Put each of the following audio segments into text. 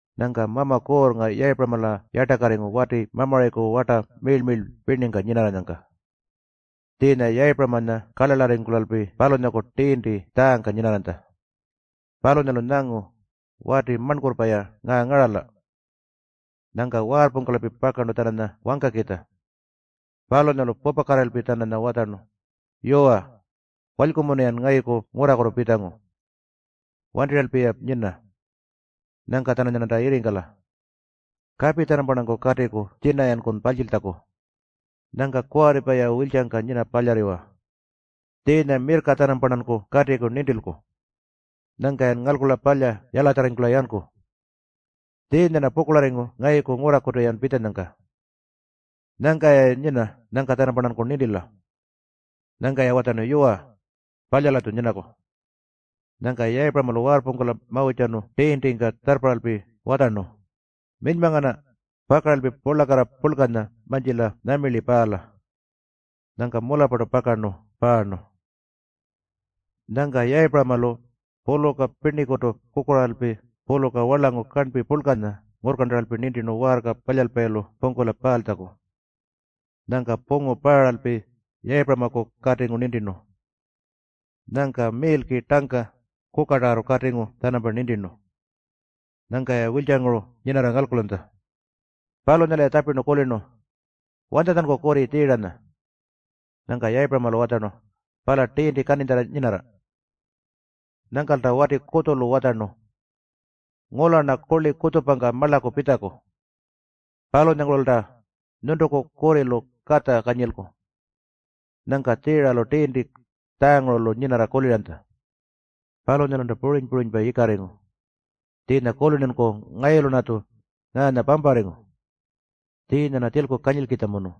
Nyangka Mama Kuurrnga Yayipuramala yartakarringu wati Mamurayiku warta miirl-miirlpa pirningka nyinarranyangka. Tjiinya Yayipuramanya karlarlarringkulalpi palunyaku tiinti tjaangka nyinarranytja. Palunyalu nyangu, “Wati marnkurrpa-ya ngaa ngarala!” Nyangka waarrpungkulalpi pakarnu-tjananya wangkakitja. Palunyalu pupakatirralpi-tjananya watjarnu, “Yuwa, walykumunu-yan ngayuku ngurrakutu pitjangu. Wantirralpi-ya nyina. Nyangka-tjananyarnanta yirringkala. Kapi-tjanamparnanku katiku tjina-yankun parltjiltjaku. Nyangka kuwarripa-ya wiltjangka nyina palyarriwa. Tjiinya mirrka-tjanamparnanku katiku nintilku. Nyangka-yan ngalkula palya yalatjarringkula yanku. Tjiinya-rna pukurlarringu ngayuku ngurrakutu-yan pitjanyangka. Nyangka-ya nyina nyangka-tjanamparnanku nintila.” Nyangka-ya watjarnu, “Yuwa, palya-latju nyinaku.” Nyangka Yayipuramalu waarrpungkula mawirrtjarnu tiintingka tjarrparralpi watjarnu, “Minyma ngana, pakaralpi purlakarra purlkanya mantjila nyuma paala.” Nyangka mularrpartu pakarnu paarnu. Nyangka Yayipuramalu puluka pirnikutu kukurraaralpi puluka warlangu karnpi purlkanya ngurrkarntaralpi nintirnu waarka palyalpayilu pungkula paaltjaku. Nyangka pungu paaralpi Yayipuramaku katingu nintirnu. Nyangka miilki tangka, kukatarrartu katingu-tjanampa nintirnu. Nyangka-ya wiltjanguru nyinarra ngalkulanytja. Palunyalu-ya tjapirnu, “Wanytjatjanku kurri Tjiiranya?” Nyangka Yayipuramalu watjarnu, “Pala tiinti kaninytjarra nyinarra.” Nyangkalta wati kutjulu watjarnu, “Ngula-rna kurli kutjupangka marlaku pitjaku. Palunyangurulta nyuntuku kurrilu katja kanyilku.” Nyangka Tjiiralu tiinti tjaangurulu nyinarra kuliranytja. Palunyalulta puriny-purinypa yikarringu, tjiinya kulirnunku, “Ngayulu-rnatju ngaanya pamparringu. Tjiinya-rna tjilku kanyilkitjamunu.”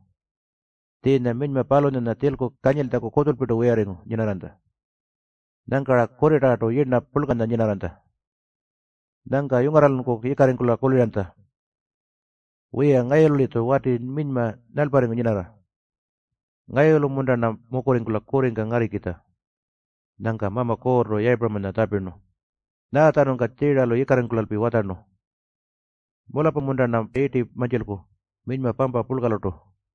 Tjiinya minyma palunyanya tjilku kanyiltjaku kutjulpirtu wiyarringu nyinarranytja. Nyangka-ra kurritarrartu yirna purlkanya nyinarranytja. Nyangka yungarralunku yikarringkula kuliranytja, “Wiya, ngayulu-litju wati minyma nyalparringu nyinarra. Ngayulu-munta-rna mukurringkula kurringka ngarrikitja?” Nyangka Mama Kuurrtu Yayipuramanya tjapirnu, “Nyaatjanungka Tjiiralu yikarringkulalpi watjarnu, ‘Mularrpa-munta-rna yirti mantjilku minyma pampa purlkalurtu?’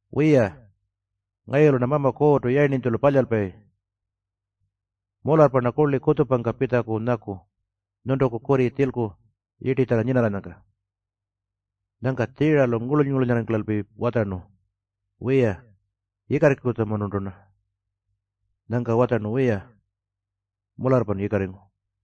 Wiya, ngayulu-rna Mama Kuurrtu yayirninytjulu palyalpayi. Kutjupa-kutjupa-munta-rna purtu palyalku? Mularrpa-rna kurli kutjupangka pitjaku nyaku nyuntuku kurri tjilku yirtitjarra nyinarranyangka.” Nyangka Tjiiralu ngurluny-ngurlunyarringkulalpi watjarnu, “Wiya, yikarringkutjamunurtu-rna.” Nyangka watjarnu, “Wiya, mularrpan yikarringu.”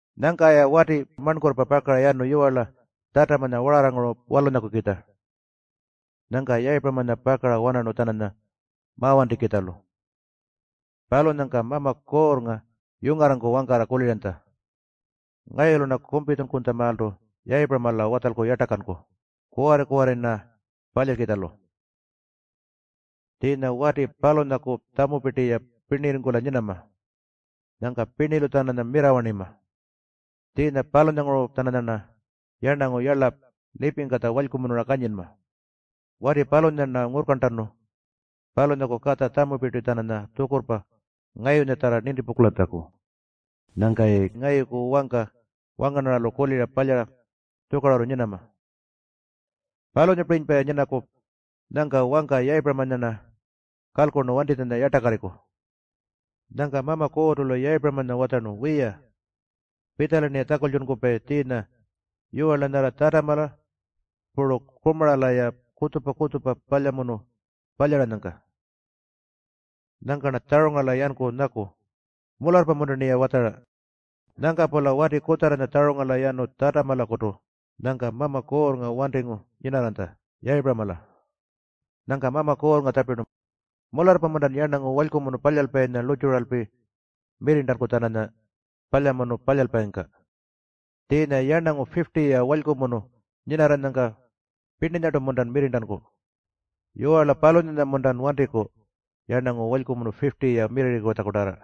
Nyangka-ya wati marnkurrpa pakara yanu yiwarla Tjatamanya wararrangurulu walunyakukitja. Nyangka Yayipuramanya pakara wanarnu-tjananya mawantikitjalu. Palunyangka Mama Kuurrnga yungarranku wangkarra kuliranytja, “Ngayulu-rna kumpitjunkutjamaaltu Yayipuramala watjalku yartakanku kuwarri-kuwarrinya-rna palyalkitjalu. Tjiinya wati palunyaku tjamupirti-ya pirnirringkula nyinama. Nyangka pirnilu-tjananya mirrawarnima. Tjiinya palunyalanguru-tjananyarna yarnangu yarla lipingkatja walykumunura kanyinma Wati palunyanya-rna ngurrkarntanu palunyaku katja puru tjamupirti-tjananya tjukurrpa ngayunyatjarra nintipungkulatjaku nyangka-yayi ngayuku wangka wangarnarralu kulira palyara tjukarurru nyinama. Palunyapirinypa-ya nyinaku, nyangka wangka Yayipuramanya-rna kalkurnu wantitjanya yartakarriku.” Nyangka Mama Kuurrtu-lu Yayipuramanya watjarnu, “Wiya, pitjala-rniya tjakultjunkupayi tjiinya yiwarla nyarra Tjatamala puru Kumarala-ya kutjupa-kutjupa palyamunu palyaranyangka. Nyangka-rna tjarungarala yanku nyaku, ‘Mularrpa-munta-rniya watjara?’” Nyangka-pula wati kutjarranya tjarungarala yanu Tjatamalakutu. Nyangka Mama Kuurrnga wantingu nyinarranytja Yayipuramala. Nyangka Mama Kuurrnga tjapirnu, “Mularrpa-muntan yarnangu walykumunu palyalpayinya lurrtjuralpi mirrirntanku-tjananya palyamunu palyalpayingka? Tjiinya yarnangu 50-ya walykumunu nyinarranyangka pirninyartu-muntan mirrirntanku? Yiwarla palunyanya-muntan wantiku yarnangu walykumunu 50-ya mirrirritjakutarra?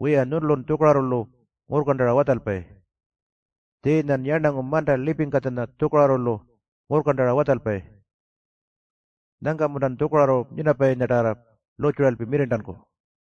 Wiya, nyuntulun tjukarurrulu ngurrkarntara watjalpayi. Tjiinyan yarnangu manta lipingkatjanya tjukarurrulu ngurrkarntara watjalpayi. Nyangka-muntan tjukarurru nyinapayinyatarra lurrtjuralpi mirrirntanku?”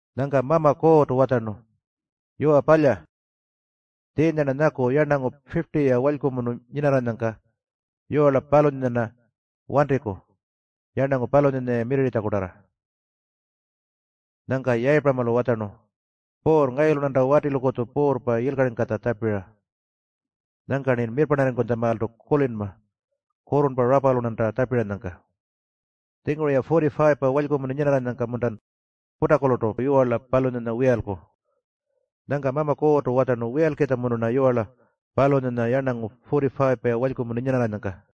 Nyangka Mama Kuurrtu watjarnu, “Yuwa palya. Tjiinya-rna nyaku yarnangu 50-ya walykumunu nyinarranyangka yiwarla palunyanya-rna wantiku yarnangu palunyanya-ya mirrirritjakutarra.” Nyangka Yayipuramalu watjarnu, “Puurr, ngayulu-rnanta watilukutju Puurrpa yilkaringkatja tjapira. Nyangka-rni mirrparnarrinytjamaaltu kulinma kurrurnpa rapalu-rnanta tjapiranyangka. Tjinguru-ya 45-pa walykumunu nyinarranyangka-muntan putakulurtu yiwarla palunyanya wiyalku?” Nyangka Mama Kuurrtu watjarnu, “Wiyalkitjamunu-rna yiwarla palunyanya yarnangu-ya 45-pa walykumunu nyinarranyangka.”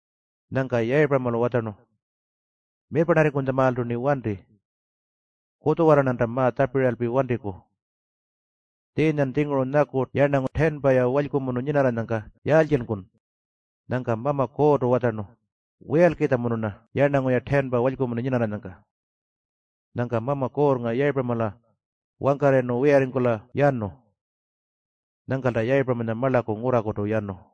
Nyangka Yayipuramalu watjarnu, “Mirrparnarrinytjamaaltu-rni wanti. Kutjuwarra-rnanta ma-tjapiralpi wantiku. Tjiinya-tjingurun nyaku yarnangu 10-pa walykumunu nyinarranyangka yaaltjinku?” Nyangka Mama Kuurrtu watjarnu, “Wiyalkitjamunu-rna yarnangu-ya 10-pa walykumunu nyinarranyangka.” Nyangka Mama Kuurrnga Yayipuramala wangkarrayirnu wiyarringkula yanu. Nyangkalta Yayipuramanya marlaku ngurrakutu yanu.